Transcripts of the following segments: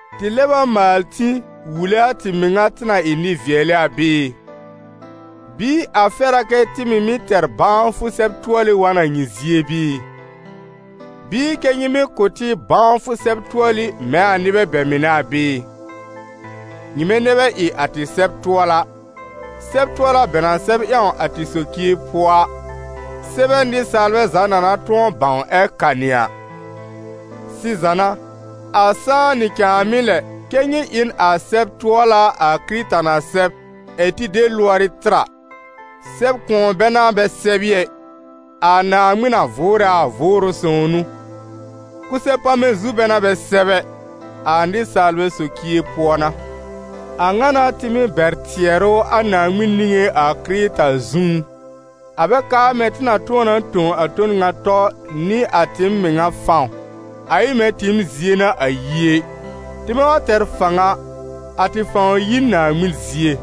Tɩ lɛb a maal tĩ wule a tɩɩm mɩŋa tɩ na ɩ nɩ-vɩɛlɩ a bɩɩ? Bɩɩ a fɛr a kɛ tɩ mɩ̀ mɩ́ tɛr bãwfʋ sɛb-tʋɔlɩ wa n a nyɩ zie bɩɩ? Bɩɩ kɛ́ nyɩ mɩ́ kʋ̀ tɩ bãwfʋ sɛb-tʋɔlɩ mɛ̃ a nɩbɛ bɛ mɩnɛ a bɩɩ? Nyɩmɛ nɛ bɛ ɩ a tɩ sɛb-tʋɔla, sɛb-tʋɔla bɛ na sɛb ƴãw a tɩ socie pʋɔ a, sɛbɛ nɩsaalbɛ za na na tʋ̃ɔ bãw ɛ kanɩ a. Sɩza n'a, a sãá nɩ cãàmɩ lɛ kɛ́ nyɩ ɩ n a sɛb-tʋɔla a Kɩrɩta na sɛb ɛ̀ tɩ de lʋɔrɩ tɩr a. Sɛb-kʋ̃ɔ bɛ n'a bɛ sɛb ɩ ɛ, a Naaŋmɩn na vʋʋrɛ a, Vʋʋrʋ Sõw n'ʋ; kʋsɛ-pamɛ zu bɛ n'a bɛ sɛb ɛ, a nɩsaalbɛ socie pʋɔ n'a. A ŋa n'a tɩ mɩ́ bɛr tɩɛrʋ a Naaŋmɩn niŋé a Kɩrɩta zũú. A bɛ kaar mɛ̃ tɩ na tʋ̃ɔ na tõ a ton ŋa tɔ nɩ a tɩɩm mɩŋa fãw, a ɩ mɛ̃ tɩɩm zie n'a a yi ɛ; tɩmɛ wa tɛr fãw a, a tɩ fãw yi n Naaŋmɩn zie.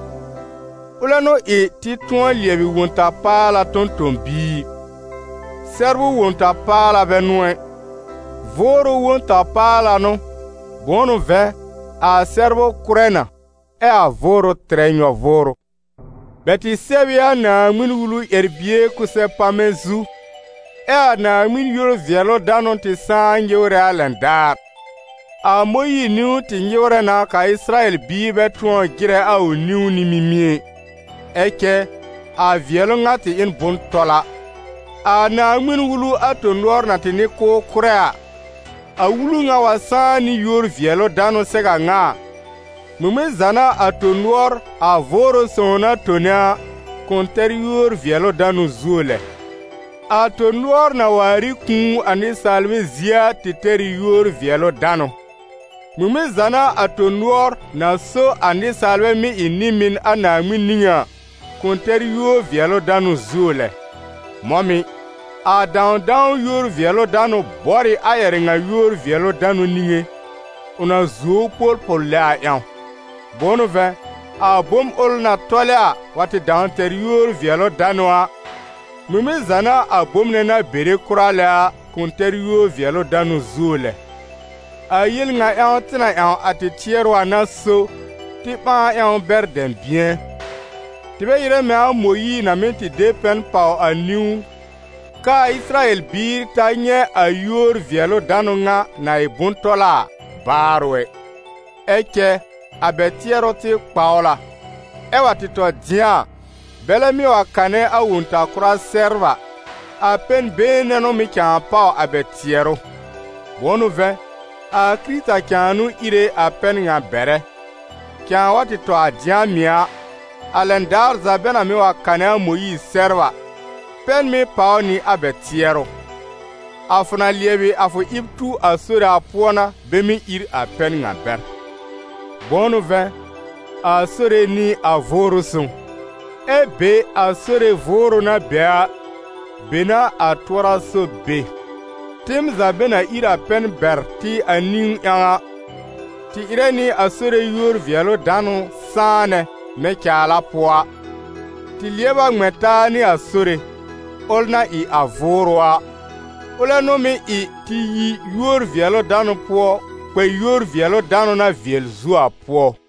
Ʋlɛ n'ʋ ɩ tɩ tʋ̃ɔ lɩɛbɩ Wõ-ta-paala tõ-tõ-biir. Sɛbrʋ Wõ-ta-paala bɛ n'ʋ ɛ, Vʋʋrʋ Wõ-ta-paala n'ʋ, bʋ̃ʋ n'ʋ vɛ̃, a sɛbrʋ kʋ́rɛ na ɛ a Vʋʋrʋ tɩrɛ nyɔ-vʋʋrʋ. Bɛ tɩ sɛb ɩ a Naaŋmɩn-Wulu ƴɛr-bie kʋsɛ-pamɛ zu, ɛ́ a Naaŋmɩn yúor-vɩɛlʋ-danʋ tɩ sãá nyɩwrɛ a lɛn daar. A Mõyiir niwn tɩ nyɩwrɛ na k'a Ɩsɩrayɛl biir bɛ tʋɔr jɩrɛ a ʋ niwn nɩ mimie ɩ, ɛ cɛ a vɩɛlʋ ŋa tɩ ɩ n bʋ̃-tɔla. A Naaŋmɩn-Wulu a tõ-nʋɔr na tɩ n'ɩ k'ʋʋ kʋ́rɛ a, a Wulu ŋa wa sãá nɩ yúor-vɩɛlʋ-danʋ sɛw a ŋa a, ŋmɩŋmɩn za n'a a tõ-nʋɔr, a Vʋʋrʋ Sõw na tone a, kʋ̃ tɛr yúor-vɩɛlʋ-danʋ zuo lɛ? A tõ-nʋɔr na waar ɩ kũu a nɩsaalbɛ zie a tɩ tɛr ɩ yúor-vɩɛlʋ-danʋ; ŋmɩŋmɩn za n'a a tõ-nʋɔr, na so a nɩsaalbɛ mɩ́ ɩ nɩ-mɩn a Naaŋmɩn niŋé a, kʋ̃ tɛr yúor-vɩɛlʋ-danʋ zuo lɛ? Mɔ̃ mɩ̀, a dãwdãw yúor-vɩɛlʋ-danʋ bɔr ɩ a ƴɛrɛ ŋa yúor-vɩɛlʋ-danʋ niŋé, ʋ na zuo ʋ polpol lɛ a ƴãw. Bʋ̃ʋ n'ʋ vɛ̃, a bom ʋl na tɔlɛ a, wa tɩ dãw tɛr yúor-vɩɛlʋ-danʋ a, ŋmɩŋmɩn za n'a a bom nɛ na bere kʋra lɛ a kʋ̃ tɛr yúor-vɩɛlʋ-danʋ zuo lɛ? A yel ŋa ƴãw tɩ na ƴãw a tɩ tɩɛrʋ a n'a so, tɩ ɓãa ƴãw bɛr dɛ̃bɩ̃ɛ. Tɩ bɛ ɩrɛ mɛ̃ a Mõyiir na mɩ́ tɩ de pɛn pàw a niwn k'aa Ɩsɩrayɛl biir ta nyɛ̃ a yúor-vɩɛlʋ-danʋ ŋa, na ɩ bʋ̃-tɔla a, baarʋ ɛ. Ɛ cɛ a bɛ tɩɛrʋ tɩ kpawl a, ɛ wa tɩ tɔ dɩ̃a a, bɛlɛ mɩ́ wa kanɛ a Wõ-ta-kʋra sɛbr a, a pɛn-been nɛ n'ʋ mɩ̀ cãa pàw a bɛ tɩɛrʋ. Bʋ̃ʋ n'ʋ vɛ̃, a Kɩrɩta cãa n'ʋ íre a pɛn ŋa bɛrɛ. Cãa wa tɩ tɔ a dɩ̃a mɩ̀ a, a lɛn daar za bɛ na mɩ́ wa kanɛ a Mõyiir sɛbr a, pɛn mɩ́ pàw nɩ a bɛ tɩɛrʋ. A fʋ na lɩɛbɩ a fʋ ɩb tu a Sore a pʋɔ n'a bɛ mɩ́ ír a pɛn ŋa bɛr. Bʋ̃ʋ n'ʋ vɛ̃, a Sore n'ɩ a Vʋʋrʋ Sõw, ɛ be a Sore Vʋʋrʋ na be a, be n'a a tʋɔra-sob be. Tɩɩm za bɛ na ír a pɛn bɛr tɩ a niwn ƴãw a, tɩ ɩrɛ nɩ a Sore yúor-vɩɛlʋ-danʋ sãanɛ mɛ̃ caala pʋɔ a, tɩ lɩɛb a ŋmɛ̃ taa nɩ a Sore, ʋl na ɩ a Vʋʋrʋ a, ʋlɛ n'ʋ mɩ́ ɩ tɩ yi yúor-vɩɛlʋ-danʋ pʋɔ kpɛ yúor-vɩɛlʋ-danʋ na vɩɛl zuo a pʋɔ.